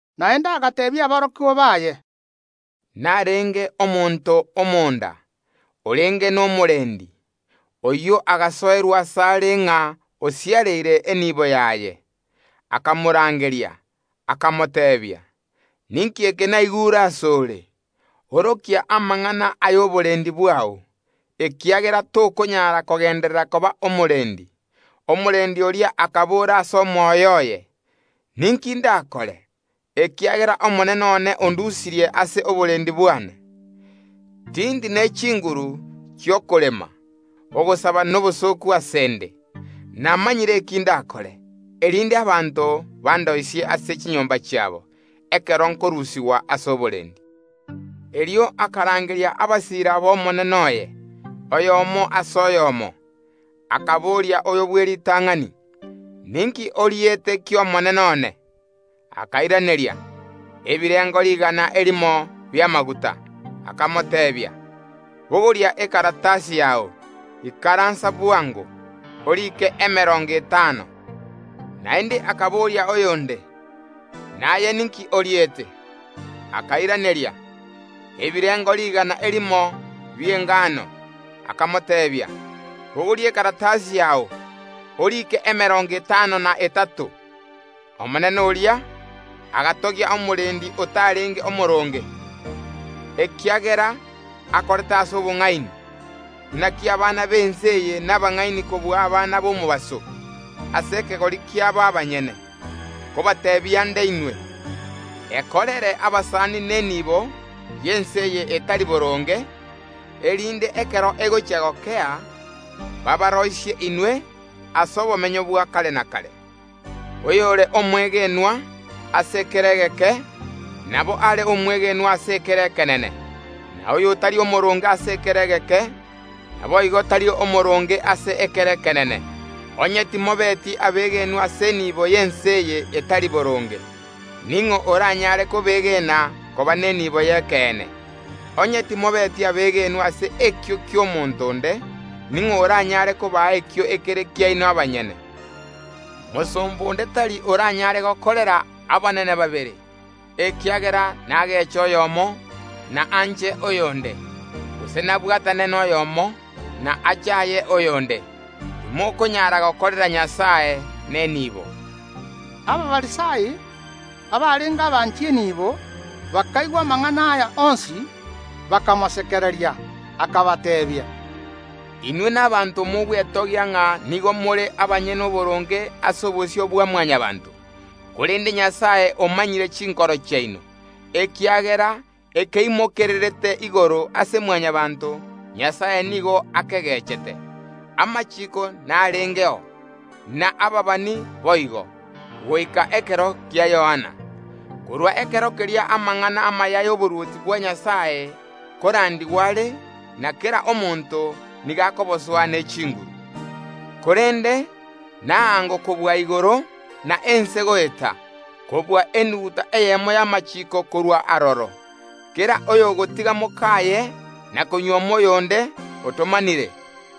Naende agateebia aborokigwa baye, Narenge omonto omonda, orenge nomorendi. Oyio agasoerwa asare ng’a osiareire enibo yaye. Akamorangeria, akamoteebia: Ninki eke naigure ase ore? Orokia amang’ana y’oborendi bwao, ekiagera tokonyara kogenderera koba omorendi. Omorendi oria akabora ase omoyo oye: Ninki ndakore, ekiagera omonene one ondusirie ase oborendi bwane? Tindi ne chinguru chi’okorema; ogosaba nobosooku ase ’nde. Namanyire eke ndakore, erinde abanto bandoisie ase chinyomba chiabo, ekero nkorusigwa ase oborendi. Erio akarangeria abasiira b’omonene oye, oyomo ase oyomo, akaboria oyo bw’eritang’ani: Ninki oriete ki’omonene one? Akairaneria: Ebirengo rigana erimo bi’amaguta. Akamoteebia: Bogoria ekaratasi yao, ikaransa bwango, oriike emerongo etano. Naende akaboria oyonde: Naye ninki oriete? Akairaneria: Ebirengo rigana erimo bi’engano. Akamoteebia: Bogoria ekaratasi yao, orike emerongo etano na etato. Omonene oria agatogia omorendi otarenge omooronge, ekiagera akorete ase obong’aini. Naki abana b’ense eye nabang’aini kobua abana b’omobaso, ase ekegori kiabo abanyene. Nkobateebia nde inwe: Ekorere abasani nenibo y’ense eye etari boronge, erinde ekero egochia gokea, baabaroisie inwe ase obomenyo bwa kare na kare. Oyore omwegenwa ase ekere egeke, nabo are omwegenwa ase ekere ekenene; na oyotari omooronge ase ekere egeke, naboigo tari omooronge ase ekere ekenene. Onye timobeti abegenwa ase enibo y’ense eye etari boronge, ning’o oranyare kobegena koba nenibo y’ekeene? Onye timobeti abegenwa ase ekio ki’omonto onde, ning’o oranyare kobaa ekio ekere kiaino abanyene? Mosomba onde tari oranyaare gokorera abanene babere, ekiagera nageeche oyomo, na anche oyonde, gose nabwatane noyomo, na achaaye oyonde. Timokonyara gokorera Nyasae na enibo. Abafarisai abarenge abanchi enibo bakaigwa amang’ana aya onsi, bakamosekereria. Akabateebia, “Inwe nabaanto mogwetogia ng’a nigo more abanyene oboronge ase obosio bwa Mwanyabaanto, korende Nyasae omanyire chinkoro chiaino, ekiagera ekeimokererete igoro ase Mwanyabaanto, Nyasae nigo akegechete. “Amachiiko narengeo, na ababani boigo, goika ekero kia Yohana. Korwa ekero keria amang’ana amaya ay’oborwoti bwa Nyasae nkorandigwa are, na kera omonto nigo akobosoa ne chinguru. Korende naango kobua igoro na ense goeta, kobua enuguta eyemo y’amachiiko korua aroro. “Kera oyogotiga mokaye na konyuoma oyonde otomanire,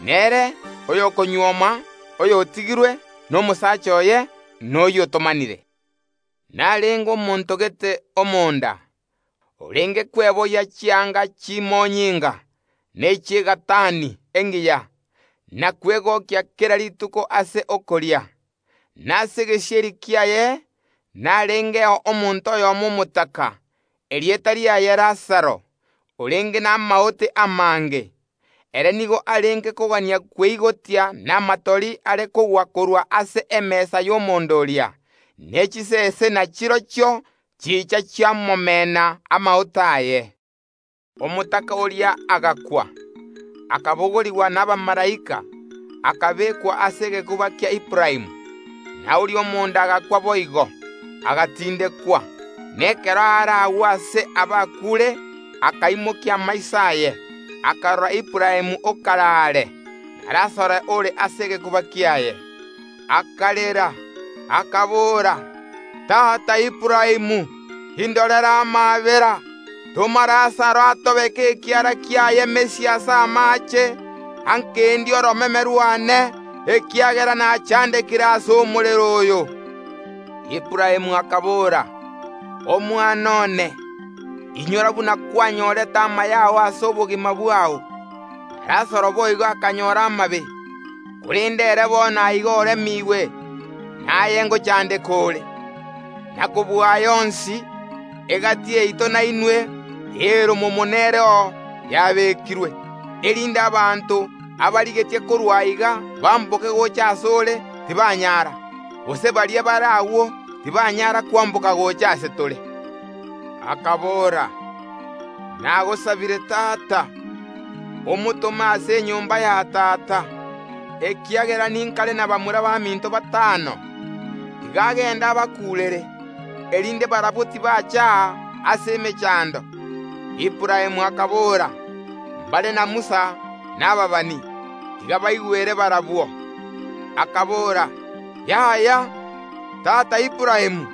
nere oyokonyuoma oyotigirwe nomosaacha oye, noyio otomanire. “Narenge omonto gete omonda, orenge kweboyia chianga chimonyinga na echi’egatani engiya, na kwegokia kera rituko ase okoria. Na ase egesieri kiaye narengeo omonto oyomo omotaka, erieta riaye Lazaro, orenge namaote amange. Ere nigo arenge kogania kweigotia namatori are kogwa korwa ase emesa y’omonda oria, ne chisese nachirochio chicha chiamomena amaote aye. Omotaka oria agakwa, akabogorigwa nabamalaika, akabeekwa ase egekuba kia Aburaamu. Na oria omonda agakwa boigo, agatindekwa, na ekero aare agwo aase Eora y’amakweri akaimokia amaiso aye, akarora Aburaamu okare aare, na Lazaro ore ase egekuba kiaye. Akarera, akabora: Tata Aburaamu, indorera amaabera, toma Lazaro atobeke ekiara kiaye mesia ase amaache, akendie oromeme rwane, ekiagera nachandekire ase omorero oyo. Aburaamu akabora: Omwana one, inyora buna kwanyorete amaya ao ase obogima bwao, na Lazaro boigo akanyora amabe, korende ere bono aiga oremiigwe, na aye ngochandeka ore. Na kobua aya onsi, egati yaito na inwe eoromomo nereo yabeekirwe, erinde abanto abarigetie korua aiga bamboke gocha ase ore tibanyara, gose baria bare agwo tibanyara kwamboka gocha ase tore. Akabora: Nagosabire tata, omotome ase enyomba ya tata, ekiagera ninkare nabamura baminto batano; tiga agende abakuurere, erinde barabwo tibacha aa ase emechando. Aburaamu akabora: Mbare na Musa na ababani; tiga baigwere barabwo. Akabora: Yaya, tata Aburaamu,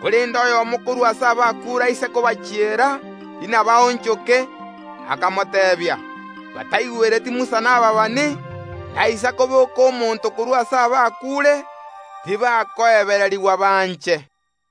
korende oyomo korwa ase abakuure aise kobachiera, inabaonchoke. Akamoteebia: Bataigwereti Musa na ababani, naisa koboka omonto korwa ase abakuure, tibakoebererigwa banche.”